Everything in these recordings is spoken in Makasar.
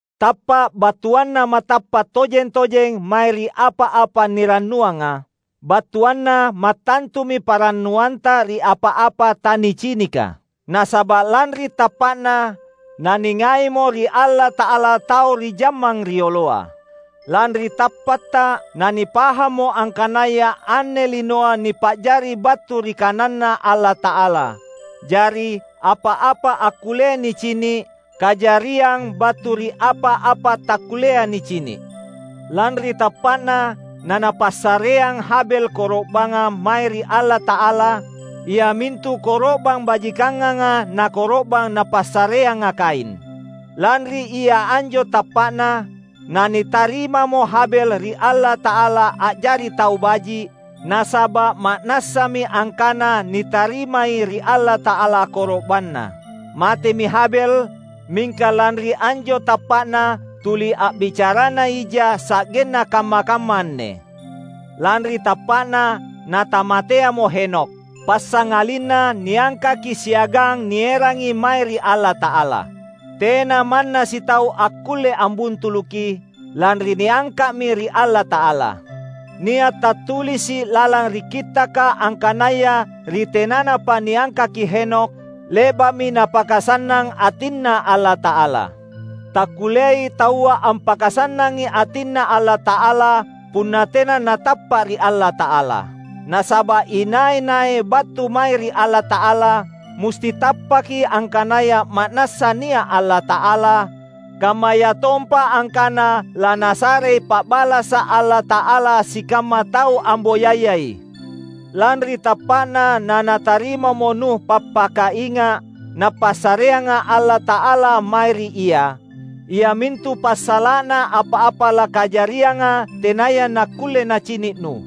Tappa’ battuanna matappa’ tojeng-tojeng mae ri apa-apa nirannuanga; battuanna mattantumi panrannuanta ri apa-apa tanicinika. Nasaba’ lanri tappa’na, naningaimo ri Allata’ala tau ri jammang rioloa. Lanri tappatta, nanipahammo angkanaya anne linoa nipa’jari battu ri KananNa Allata’ala; jari, apa-apa akkullea nicini’, kajariang battu ri apa-apa takkullea nicini’. Lanri tappa’na, nanapassareang Habel koro’banga mae ri Allata’ala, iamintu koro’bang bajikanganga na koro’bang napassareanga Kain. Lanri ia anjo tappa’na, nanitarimamo Habel ri Allata’ala a’jari tau baji’; nasaba’ ma’nassami angkana nitarimai ri Allata’ala koro’banna. Matemi Habel, mingka lanri anjo tappa’na, tuli a’bicarana ija sa’genna kamma-kamma anne. Lanri tappa’na, natamateamo Henokh; passangalinna niangkaki siagang nierangi mae ri Allata’ala. Tena manna sitau akkulle ambuntuluki, lanri niangka’mi ri Allata’ala. Nia’ tattulisi’ lalang ri Kittaka angkanaya ri tenanapa niangkaki Henokh, le’ba’mi napakasannang atinNa Allata’ala. Takkulleai taua ampakasannangi atinNa Allata’ala, punna tena natappa’ ri Allata’ala. Nasaba’ inai-nai battu mae ri Allata’ala, musti tappaki angkanaya ma’nassa nia’ Allata’ala, kammayatompa angkana laNasarei pa’balasa’ Allata’ala sikamma tau amboyayai. Lanri tappa’na nanatarimamo Nuh pappakainga’ Napassareanga Allata’ala mae ri ia; iamintu passala’na apa-apa lakajarianga tenaya nakkulle nacini’ Nuh.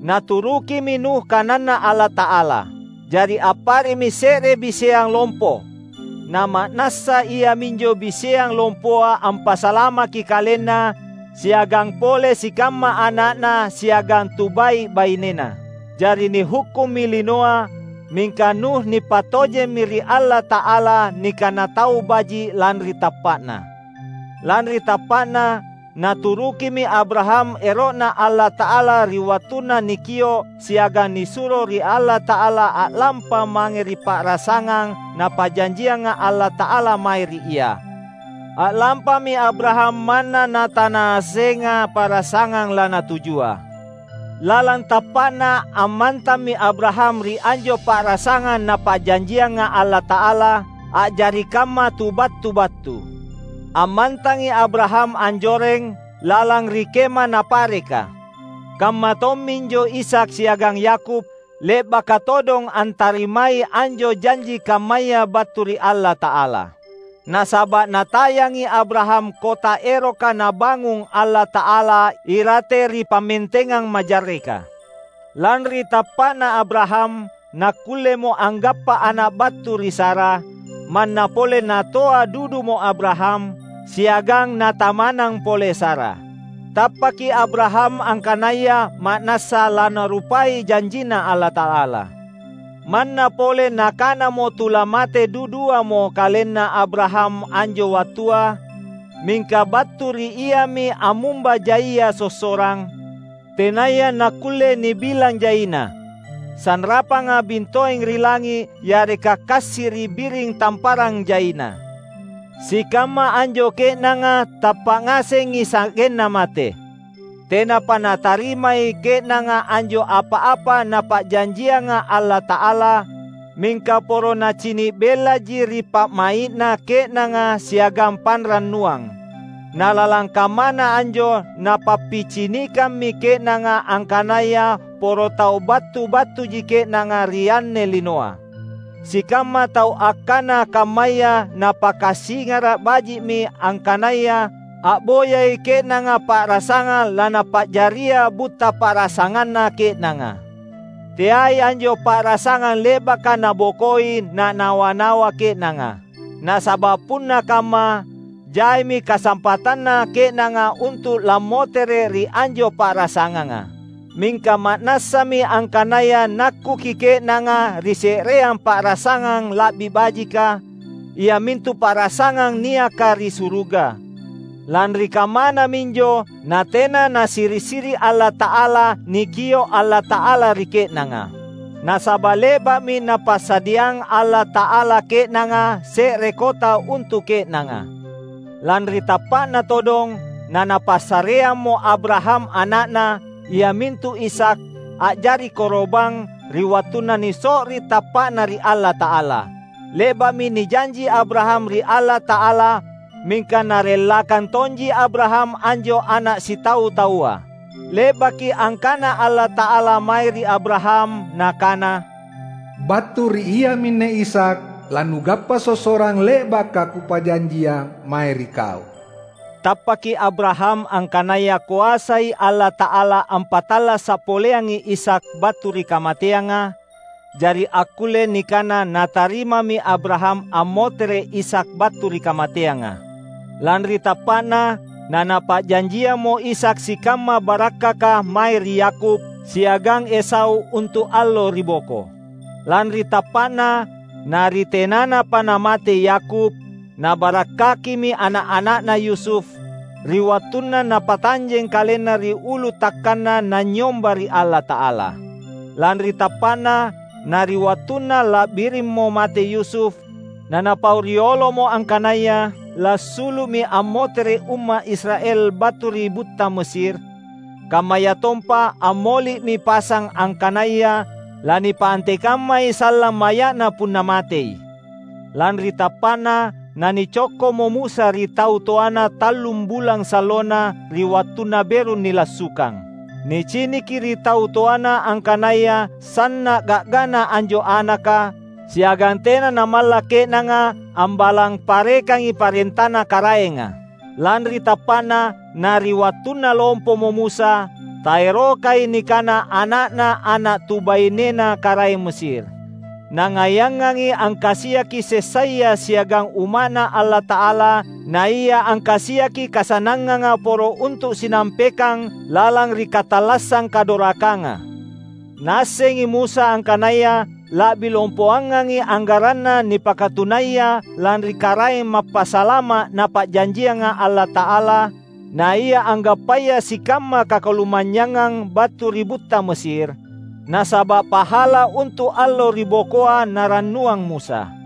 Naturukimi Nuh kananNa Allata’ala. Jari appare’mi se’re biseang lompo. Nama’nassa iaminjo biseang lompoa ampasalamaki kalenna siagang pole sikamma ana’na siagang tubai’-bainena. Jari nihukkummi linoa, mingka Nuh nipattojemmi ri Allata’ala nikana tau baji’ lanri tappa’na. Lanri tappa’na, naturukimi Abraham ero’Na Allata’ala ri wattunna nikio’ siagang nisuro ri Allata’ala a’lampa mange ri pa’rasangang Napa’janjianga Allata’ala mae ri ia. A’lampami Abraham manna natanaassenga pa’rasangang lanatujua. Lalang tappa’na ammantammi Abraham ri anjo pa’rasangang Napa’janjianga Allata’ala, a’jari kamma tu battu-battu. Ammantangi Abraham anjoreng, lalang ri kema napareka. Kamma tomminjo Ishak siagang Yakub, le’baka todong antarimai anjo janji kammaya battu ri Allata’ala. Nasaba’ natayangi Abraham kota eroka Nabangung Allata’ala irate ri pammentengang majarreka. Lanri tappa’na Abraham, nakkullemo angappa ana’ battu ri Sara, manna pole natoa dudumo Abraham, siagang natamanang pole Sara. Tappaki Abraham angkanaya ma’nassa laNarupai janjinNa Allata’ala. Manna pole nakanamo tulamate duduamo kalenna Abraham anjo wattua, mingka battu ri iami ammumba jaia sossorang, tenaya nakkulle nibilang jaina — sanrapanga bintoeng ri langi’ yareka kassi’ ri biring tamparang jaina. Sikamma anjo ke’nanga tappa’ ngasengi sa’genna mate. Tenapa natarimai ke’nanga anjo apa-apa Napa’janjianga Allata’ala, mingka poro nacini’ bellaji ri pa’mai’na ke’nanga siagang panrannuang. Nalalang kammana anjo napappicinikammi ke’nanga angkanaya poro tau battu-battuji ke’nanga ri anne linoa. Sikamma tau akkana kammaya napakasingara’ baji’mi angkanaya a’boyai ke’nanga pa’rasangang lanapa’jaria butta pa’rasanganna ke’nanga. Teai anjo pa’rasangang le’baka nabokoi nanawa-nawa ke’nanga. Nasaba’ punna kamma, jaimi kasampatanna ke’nanga untu’ lammotere’ ri anjo pa’rasanganga. Mingka ma’nassami angkanaya nakkuki ke’nanga ri se’reang pa’rasangang la’bi bajika, iamintu pa’rasangang niaka ri suruga. Lanri kammana minjo natena nasiri’-siri’ Allata’ala nikio’ Allata’ala ri ke’nanga. Nasaba’ le’ba’mi Napasadiang Allata’ala ke’nanga se’re kota untu’ ke’nanga. Lanri tappa’na todong, nanapassareammo Abraham ana’na, iamintu Ishak, a’jari koro’bang, ri wattunna niso’ri tappa’na ri Allata’ala. Le’ba’mi nijanji Abraham ri Allata’ala mingka narellakang tonji Abraham anjo ana’ sitau-taua. Le’baki angkana Allata’ala mae ri Abraham, Nakana, "Battu ri iaminne Ishak lanugappa sossorang le’baka Kupa’janjiang mae ri kau." Tappaki Abraham angkanaya koasai Allata’ala ampattallasa’ poleangi Ishak battu ri kamateanga — jari akkulle nikana natarimami Abraham ammotere’ Ishak battu ri kamateanga. Lanri tappa’na, nanapa’janjiammo Ishak sikamma barakkaka mae ri Yakub siagang Esau untu’ allo ri boko. Lanri tappa’na, na ri tenanapa namate Yakub, nabarakkakimi ana’-ana’na Yusuf, ri wattunna napatanjeng kalenna ri ulu takkanna nanynyomba ri Allata’ala. Lanri tappa’na, na ri wattunna la’birimmo mate Yusuf, nanapau riolomo angkanaya lassulu’mi ammotere’ umma’ Israel battu ri butta Mesir; kammayatompa ammoli’mi pasang angkanaya lanipaanteikamma sallang maya’na punna matei. Lanri tappa’na, nanicokkomo Musa ri tau toana tallum bulang sallona ri wattunna beru nilassukang. Niciniki ri tau toana angkanaya sanna’ ga’gana anjo anaka, siagang tena namalla’ ke’nanga ambalang parekangi parentana karaenga. Lanri tappa’na, na ri wattunna lompomo Musa, taerokai nikana ana’na ana’ tubainena karaeng Mesir. Nangaiangangi angkasiaki sessaya siagang umma’Na Allata’ala naia angkasiaki kasannanganga poro untu’ sinampekang lalang ri katallassang kadorakanga. Naassengi Musa angkanaya la’bi lompoangangi anggaranna nipakatunaya lanri Karaeng Mappasalama’ Napa’janjianga Allata’ala, naia anggappaya sikamma kakalumanynyangang battu ri butta Mesir; nasaba’ pahala untu’ allo ri bokoa narannuang Musa.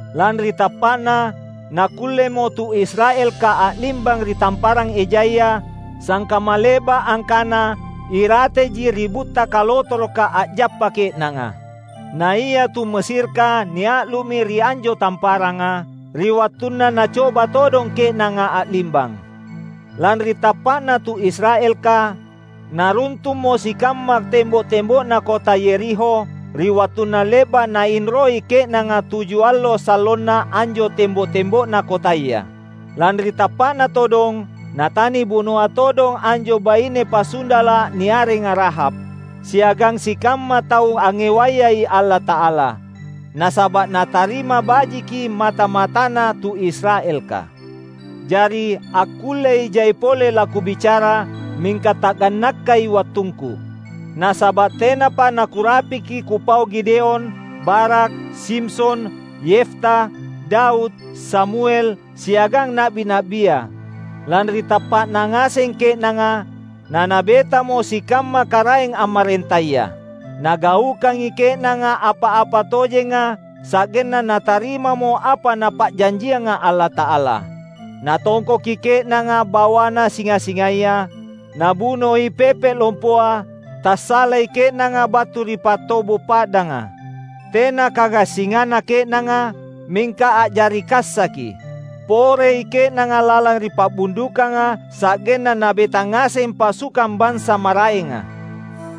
Lanri tappa’na, nakkullemo tu Israelka a’limbang ri Tamparang Ejaya, sangkamma le’ba’ angkana irateji ri butta kalotoroka a’jappa ke’nanga. Naia tu Mesirka nia’lu’mi ri anjo tamparanga, ri wattunna nacoba todong ke’nanga a’limbang. Lanri tappa’na tu Israelka, naruntummo sikamma tembo’-tembo’na kota Yerikho ri wattunna le’ba’ nainroi ke’nanga tuju allo sallona anjo tembo’-tembo’na kotaya. Lanri tappa’na todong, natanibunoa todong anjo baine pasundala’ niarenga Rahab, siagang sikamma tau angngewayai Allata’ala; nasaba’ natarima bajiki mata-matana tu Israelka. Jari, akkullei jai pole lakubicara, mingka tagannakkai wattungku. Nasaba’ tenapa nakurapiki kupau Gideon, Barak, Simson, Yefta, Daud, Samuel, siagang na’bi-na’bia. Lanri tappa’na ngaseng ke’nanga, nanabetamo sikamma karaeng ammarentaya. Nagaukangi ke’nanga apa-apa tojenga, sa’genna natarimamo apa Napa’janjianga Allata’ala. Natongkoki ke’nanga bawana singa-singaya, nabunoi pepe’ lompoa, tassalai ke’nanga battu ri pattobo’ pa’danga. Tena kagassinganna ke’nanga, mingka a’jari kassaki; porei ke’nanga lalang ri pa’bundukanga sa’genna nabeta ngaseng pasukang bansa maraenga.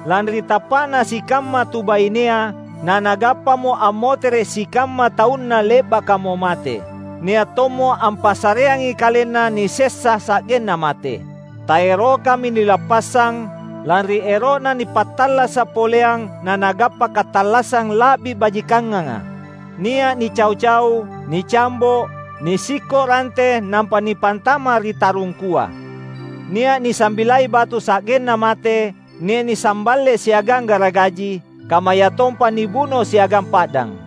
Lanri tappa’na sikamma tubainea nanagappamo ammotere’ sikamma taunna le’bakamo mate. Nia’ tommo ampassareangi kalenna nisessa sa’genna mate; taerokami nilappassang, lanri ero’na nipattallasa’ poleang nanagappa katallassang la’bi bajikanganga. Nia’ nicau-cau, nicambo’, nisikko’ rante nampa nipantama’ ri tarungkua. Nia’ nisambilai batu sa’genna mate, nia’ nisamballe siagang garagaji, kammayatompa nibuno siagang pa’dang.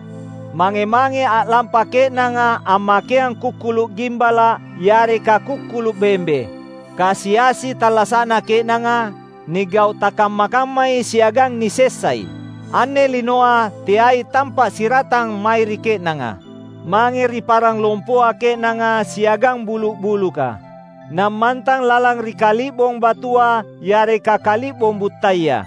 Mange-mangei a’lampa ke’nanga ammakeang kukkulu’ gimbala’ yareka kukkulu’ bembe; kasi-asi tallasa’na ke’nanga, nigau’ takamma-kammai siagang nisessai. Anne linoa teai tampa’ siratang mae ri ke’nanga. Mangei ri parang lompoa ke’nanga siagang bulu’-buluka, nammantang lalang ri kali’bong batua yareka kali’bong buttaya.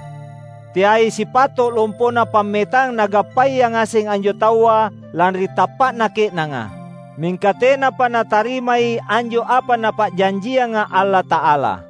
Teai sipato’ lompona pammetang nagappaya ngaseng anjo taua lanri tappa’na ke’nanga! Mingka tenapa natarimai anjo apa Napa’janjianga Allata’ala;